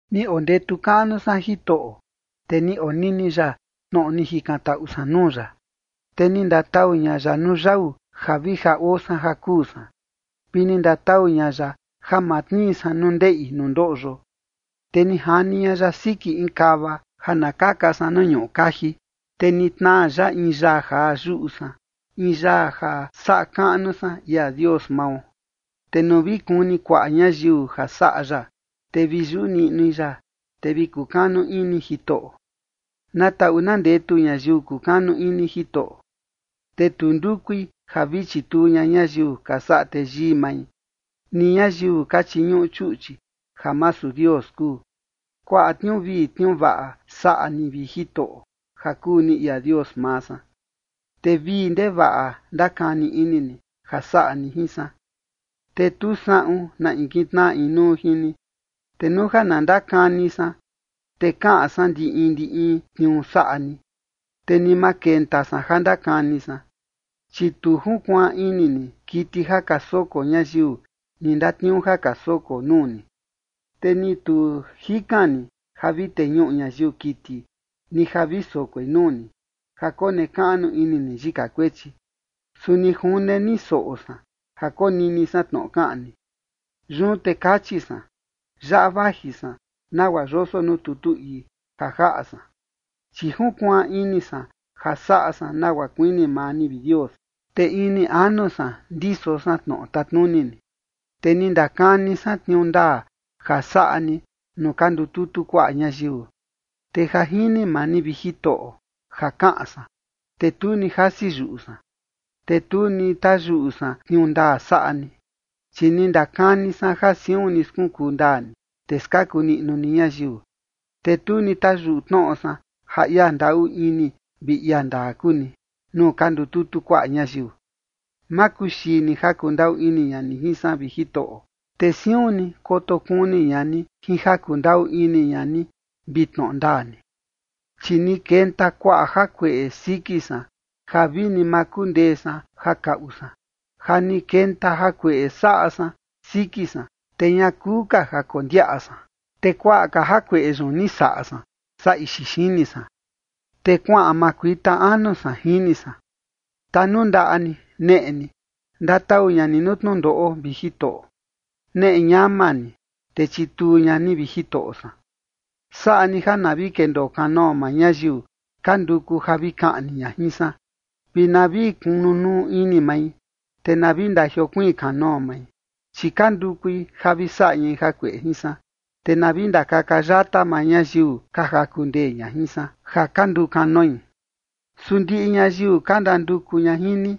Ni ondetu kaꞌnu san Jitoꞌo, te ni onini ya tnoꞌo ni jikantaꞌu san nuu ya. Te ni ndatau ña ya nuu yau ja vi ja oo san ja kuu san, vi ni ndatau ña ya ja ma tnii san nuu ndeꞌi nuu ndoꞌyo, te ni jani ña ya siki in kava, ja na kaka san nuu ñuꞌu kaji. Te ni tnaa ya in yaa jaa yuꞌu san, in yaa ja saꞌa kaꞌnu san ia Dios mao, te nuu vi kuni kuaꞌa ñayiu ja saꞌa ya, te vi yuꞌu niꞌnui ya, te vi kukanu ini Jitoꞌo. Na taꞌu na ndetu ñayiu kukanu ini Jitoꞌo, te tu ndukui ja vi chituu ña ñayiu ka saꞌa teyii mai, ni ñayiu ka chiñuꞌu chuꞌchi ja masu Dios kuu. Kuaꞌa tniuu vii tniuu vaꞌa saꞌa ni, vi Jitoꞌo ja kuu ni ia Dios maa san, te vii ndevaꞌa ndakani ini ni ja saꞌa ni jin san, te tu saꞌun na in kitnaꞌa inuu jin ni. Te nuu ja na ndakani san, te kaꞌan san ndi in ndi in tniuu saꞌa ni, te ni ma kenta san ja ndakani san. Chi tu junkuaan ini ni kiti ja ka soko ñayiu ni ndatniuu ja ka soko nuu ni, te ni tu jikan ni ja vi teñuꞌu ñayiu kiti, ni ja vi sokoi nuu ni, ja konekaꞌnu ini ni yika kuechi. Su ni june ni soꞌo san ja konini san tnoꞌo kaꞌan ni. Yun te kachi san: “Yaꞌa vaji san, nagua yoso nuu tutu ii ja jaꞌa san, chi junkuaan ini san ja saꞌa san nagua kuini maa ni, vi Dios, te ini anu san ndiso san tnoꞌo tatnuni ni. ’Te ni ndakani san tniuu ndaa ja saꞌa ni nuu ka ndututu kuaꞌa ñayiu, te ja jini maa ni, vi Jitoꞌo, ja kaꞌan san, te tu ni jasi yuꞌu san. Te tu ni tayuꞌu san tniuu ndaa saꞌa ni, chi ni ndakani san ja siun ni skunkuu ndaa ni, te skaku niꞌnu ni ñayiu. Te tu ni tayuꞌu tnoꞌo san ja ia ndaꞌu ini vi ia ndaa kuu ni nuu ka ndututu kuaꞌa ñayiu. ’Ma kuxii ni ja kundaꞌu ini ña ni jin san, vi Jitoꞌo, te siun ni koto kuni ña ni jin ja kundaꞌu ini ña ni vi tnoꞌo ndaa ni. Chi ni kenta kuaꞌa jakueꞌe siki san ja vini ma kundee san ja kaꞌu san, ja ni kenta jakueꞌe saꞌa san siki san, te ña kuu ka ja kondiaꞌa san. Te kuaꞌa ka jakueꞌe yun ni saꞌa san saa ixi xini san, te kuaꞌan makuita anu san, jini san. ’Tanundaꞌa ni neꞌe ni, ndatau ña ni nuu tnundoꞌo, vi Jitoꞌo. Neꞌe ñama ni, te chituu ña ni, vi Jitoꞌo san. Saꞌa ni ja na vi kendoo kanoo maa ñayiu ka nduku ja vi kaꞌni ña jin san, vi na vi kunu nuu ini mai, te na vi ndajiokuiin kanoo mai, chi ka ndukui ja vi saꞌa ñai jakueꞌe jin san. Te na vi ndakaka yata maa ñayiu ka jaku ndee ña jin san, ja ka nduu kanoi. Su ndiꞌi ñayiu ka ndanduku ña jin ni,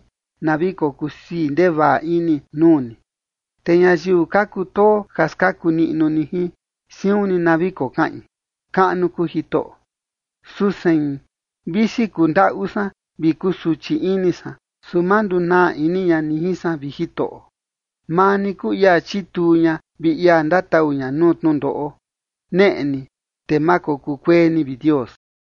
na vi kokusii ndevaꞌa ini nuu ni, te ñayiu ka kutoo ja skaku niꞌnu ni jin, siun ni na vi kokaꞌin: Kaꞌnu kuu Jitoꞌo. ’Su sein, visi kundaꞌu san vi kusuchi ini san, su ma ndunaa ini ña ni jin san, vi Jitoꞌo. Maa ni kuu ia chituu ña vi ia ndatau ña nuu tnundoꞌo. Neꞌe ni, te ma kokuu kuee ni, vi Dios.”